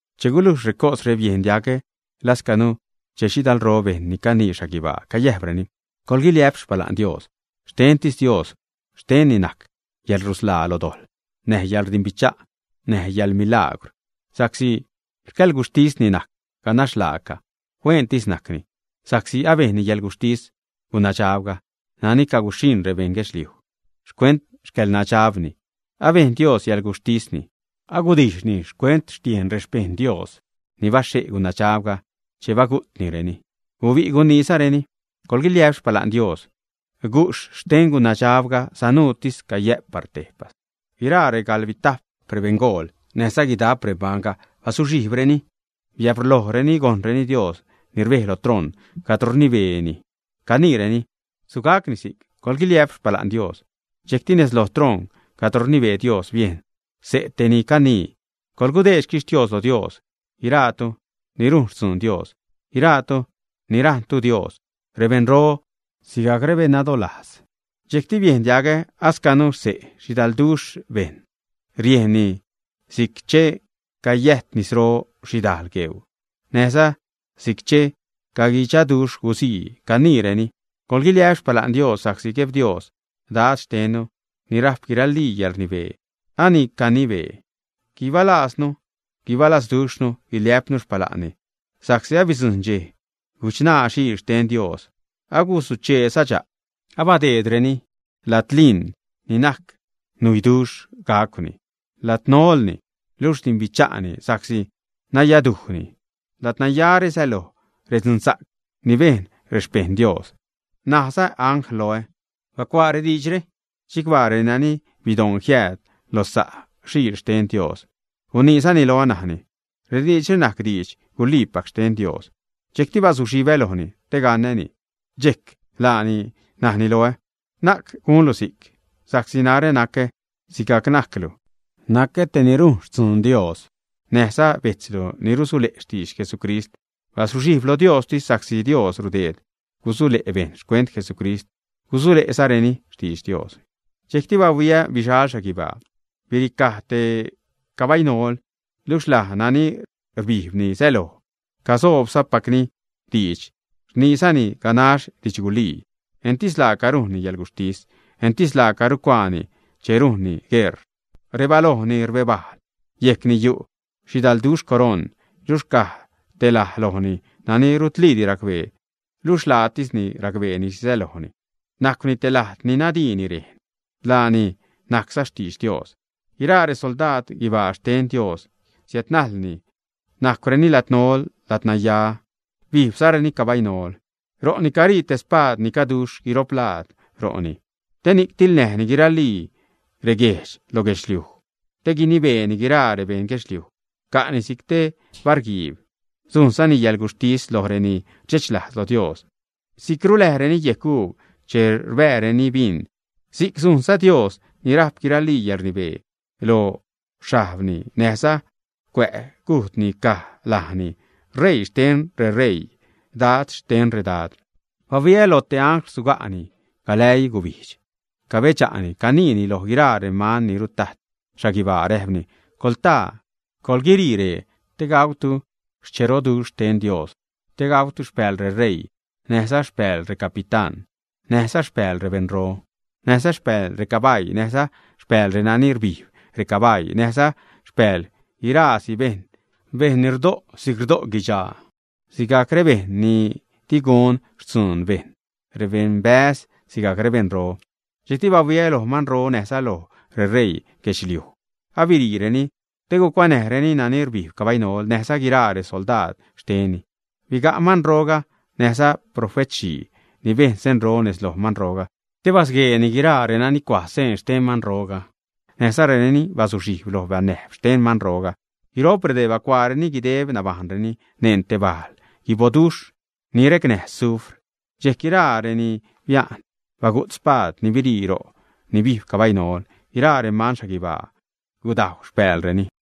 Che gulujx recosre, biejn diagä lascanu xse' xhidalro bejṉ ni canii xhaguibaa, cayäjpreni: ¡Coḻguiliä'p xpala'n Dios! Xtentis Dios, xtenni najc yäḻrusḻaa lo dojḻ, näj yäḻrdimbicha', näj yäḻmilagwr. Sa'csi xcäḻguxhtisni najc ganax laaca, huentis najcni, sa'csi abejnni yäḻguxhtis gunadxabga nani caguxhiṉ rebeṉ guedxliuj xcuent xcäḻnadxabni. Abejn Dios yäḻguxhtisni, agudijxhni xcuent xtiejn rexpejṉ Dios ni baxhe' gunadxabga, che bagu'tnireni. Guibi' guniizareni: ―¡Coḻguiliä'p xpala'n Dios! Gujxh xten gunadxabga sanuutis cayä'p par tejpas. Guiraa regalbitajp rebeṉgool näjza guidap remanbajṉga bazuxhijbreni, biabrlojreni gojṉreni Dios ni rbej lo troṉ cadro rnibeeni, caniireni: ―Sugacni si'c. ¡Coḻguiliä'p Xpala'n Dios! Dxejcti nez lo troṉ cadro rnibee Dios biejn xse' tej ni canii: Coḻgudeed xquixtios lo Dios, guira'tu ni rujn xtzuun Dios, guira'tu ni rajṉtu Dios, rebeṉro sigajc rebeṉnadolajz. Dxejcti biejn diagä ascanu xse' xhidalduxh bejṉ, riejnni si'c che cayäjt nisro xhidajl gueu, näjza si'c che caguidxaduxh guzii, caniireni: ¡Coḻguiliä'p xpala'n Dios! Sa'csi Gueb Dios, Dad xtennu ni rajp guiralii yälṟnibee, ani acanibee. Guibalajznu, guibalazduxhnu, guiliä'pnu xpala'nni sa'csi abidzujṉ dxej guchṉaa Xiil xten Dios, aguzucheeza dxa'p. Abadeedreni ladliṉ ni najc nuiduxh gacwni. Ladnolni, luxh rdimbicha'ni sa'csi nayadujni. Ladnayare säloj redzunsa'c ni bejn rexpejṉ Dios. Najza anglga loä: ―Bacuaa diidxre: “Chicbaa renani bidoṉ jiääd lo xsa' Xiil xten Dios.” Guniizani loä, najni: ―Rediidxre najc didx-guliipac xten Dios. Dxejcti bazuxhibä lojni te gaṉäni, dxejc laani najni loä: ―Na'c gunlu si'c, sa'csi narä nacä sigajc najclu, nacä te ni rujn xtzuun Dios, näjza bejtzlu ni rusule' xtidx Jesucrist. Bazuxhijb lo Diostis sa'csi Dios rudeed gusule' bejṉ xcuent Jesucrist, gusule'zareni xtidx Dios. Dxejcti bahuiä bixal xhaguibaa, biricaj te cabainol. Luxh laj nani rbijbni säloj casobsa'cpacni diidx, rniizani ganax didxgulii. Entis laaca rujnni yäḻguxhtis, entis laaca rucuaani che rujnni gueṟ. Rebalojni rbebajl, yejcni yu' xhidalduxh coroṉ, luxh caj te laj lojni nani rutliidi racbee, luxh laatisni racbeeni xhi sälojni. Najcwni te lajd ni nadiini rejn; lajni najcza Xtidx Dios. Guiraa resoldaad guibaa xten Dios siädnajlni najcwreni ladnol, ladnaya, bijbzareni cabainol. Ro'ni carii te spaad ni caduxh guiro'p laad ro'ni te ni'c tiḻnäjni guiralii reguejdx lo guedxliuj, te guinibeeni guiraa rebeṉ guedxliuj ca'ni si'c te barguiib. Sujnzani yäḻguxhtis loj reni rdxechlajz lo Dios, si'c ruläjreni yec uub che rbääreni bin, si'c sujnza Dios ni rajp guiralii yäḻrnibee. Lo xhajbni näjza cuä' cujdni caj lajni: “Reii xten reṟeii, Dad xten redad.” Bahuiä loj te angl suga'ni galäii gubijdx, cabedxa'ni caniini loj guiraa reman ni rutajt xhaguibaa, räjpni: ―Coḻtaa, coḻguire' ree, te gautu xcheroduxh xten Dios; te gautu xpääl reṟeii, näjza xpääl recapitán, näjza xpääl rebeṉro, näjza xpääl recabaii, näjza xpääl renani rbijb recabaii, näjza xpääl guiraasi bejṉ, bejṉ ni rdo' si'c rdo' guidxaa sigajc rebejṉ ni di gun xtzuun bejṉ, rebeṉbäz sigajc rebeṉro. Dxejcti bahuiä loj manro näjza loj reṟeii guedxliuj, abire'reni te gucuanäjreni nani rbijb cabainol näjza guiraa resoldaad xtenni. Biga' manroga näjza profetxhii ni bejn senro nez loj manroga te basgueeni guiraa renani cua' seen xten manroga, näjza renani bazuxhijb lo banäjb xten manroga. Guiro'p redee bacuaareni guideb nabajṉreni neṉ te bal guiboduxh ni recnäj sufr. Dxejc guiraa reni bia'n bagu't spaad ni birii ro' ni bijb cabainol. Guiraa reman xhaguibaa gudajw xpäälreni.